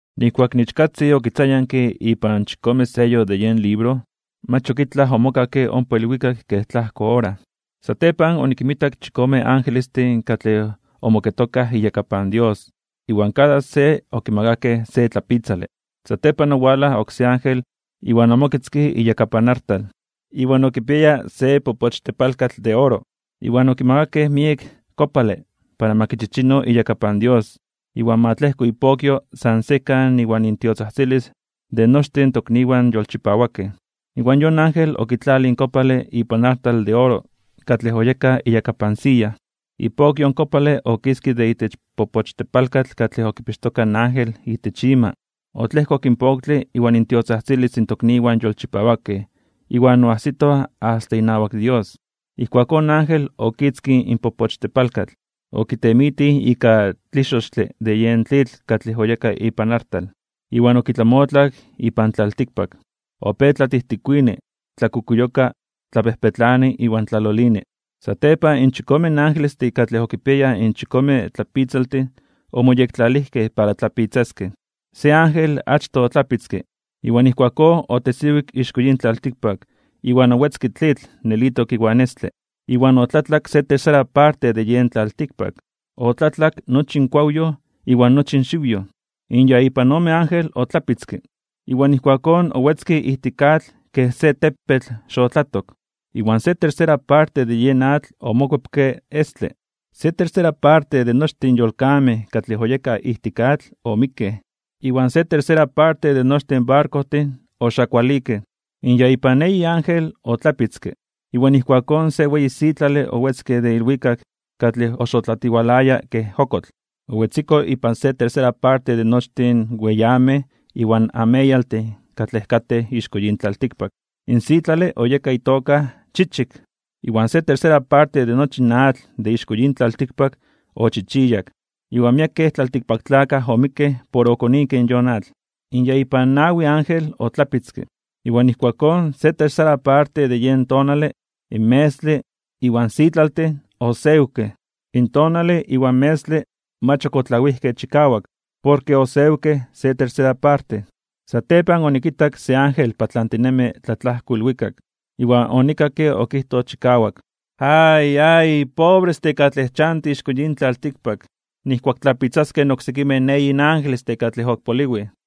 Nijkuak in Ichkatzin okitzayanke ipan chikome seyo de yen libro, mach ok itlaj omokakke ompa ilwikak kej tlajko ora. Satepan onikinmitak chikome angelestin katlej omoketokaj iyakapan Dios, iwan kada se okimakakej se tlapitzale. Satepan owalaj oksé ángel iwan omoketzke iyakapan artal, iwan okipiaya se popochtepalkatl de oro. Iwan okimakakej miek kopale para ma kichichino iyakapan Dios iwan ma tlejko ipokyo san sekan iwan intiotzajtzilis de nochtin in tokniwan yolchipawakej. Iwan yon ángel okitlalij in kopale ipan artal de oro katlej oyeka iyakapan siya. Ipokyo in kopale okiske de itech in popochtepalkatl katlej okipixtoka in ángel itech ima, otlejkok in poktle iwan intiotzajtzilis in tokniwan yolchipawakej iwan oajsito asta inawak Dios. Ijkuakón in ángel okitzkij in popochtepalkatl, okitemitij ika tlixochtle de yen tlitl katlej oyeka ipan artal, iwan okitlamotlak ipan tlaltikpak. Opéj tlatijtikuini, tlakukuyoka, tlapejpetlani iwan tlalolini. Satepan in chikome angelestin katlej okipiayaj in chikome tlapitzaltin omoyektlalijkej para tlapitzaskej. Se ángel achtoj otlapitzke, iwan ijkuakón otesiwik ixko yin tlaltikpak iwan owetzke tlitl nelitok iwan estle. Iwan otlatlak se tercera parte de yen tlaltikpak, otlatlak nochi in kuawyoj iwan nochi in xiwyoj. In ya ipan ome ángel otlapitzke, iwan ijkuakón owetzke ijtik atl kej se tepetl xotlatok. Iwan se tercera parte de yen atl omokuepke estle. Se tercera parte de nochtin in yolkamej katlej oyekaj ijtik atl omikkej, iwan se tercera parte de nochtin in barkojtin oxakualikej. In ya ipan eyi ángel otlapitzke, iwan ijkuakón se weyi sitlale owetzke de ilwikak katlej oxotlatiwalaya kej okotl. Owetziko ipan se tercera parte de nochtin in weyamej iwan ameyaltin katlej katej ixko yin tlaltikpak. In sitlale oyeka itoka Chichik. Iwan se tercera parte de nochi in atl de ixko yin tlaltikpak ochichiyak, iwan miekej tlaltikpaktlakaj omikkej por okonikej in yon atl. In ya ipan nawi ángel otlapitzke, iwan ijkuakón se tercera parte de yen tonale, in metztle, iwan sitlaltin osewkej. In tonale iwan metztle mach ok otlawijkej chikawak porke osewkej se tercera parte. Satepan onikitak se ángel patlantinemi tlatlajko ilwikak, iwan onikakke okijtoj chikawak: ―¡Ay, ay! ¡Pobrestin katlej chantij ixko yin tlaltikpak nijkuak tlapitzaskej in oksekimej eyin angelestin katlej ok poliwij!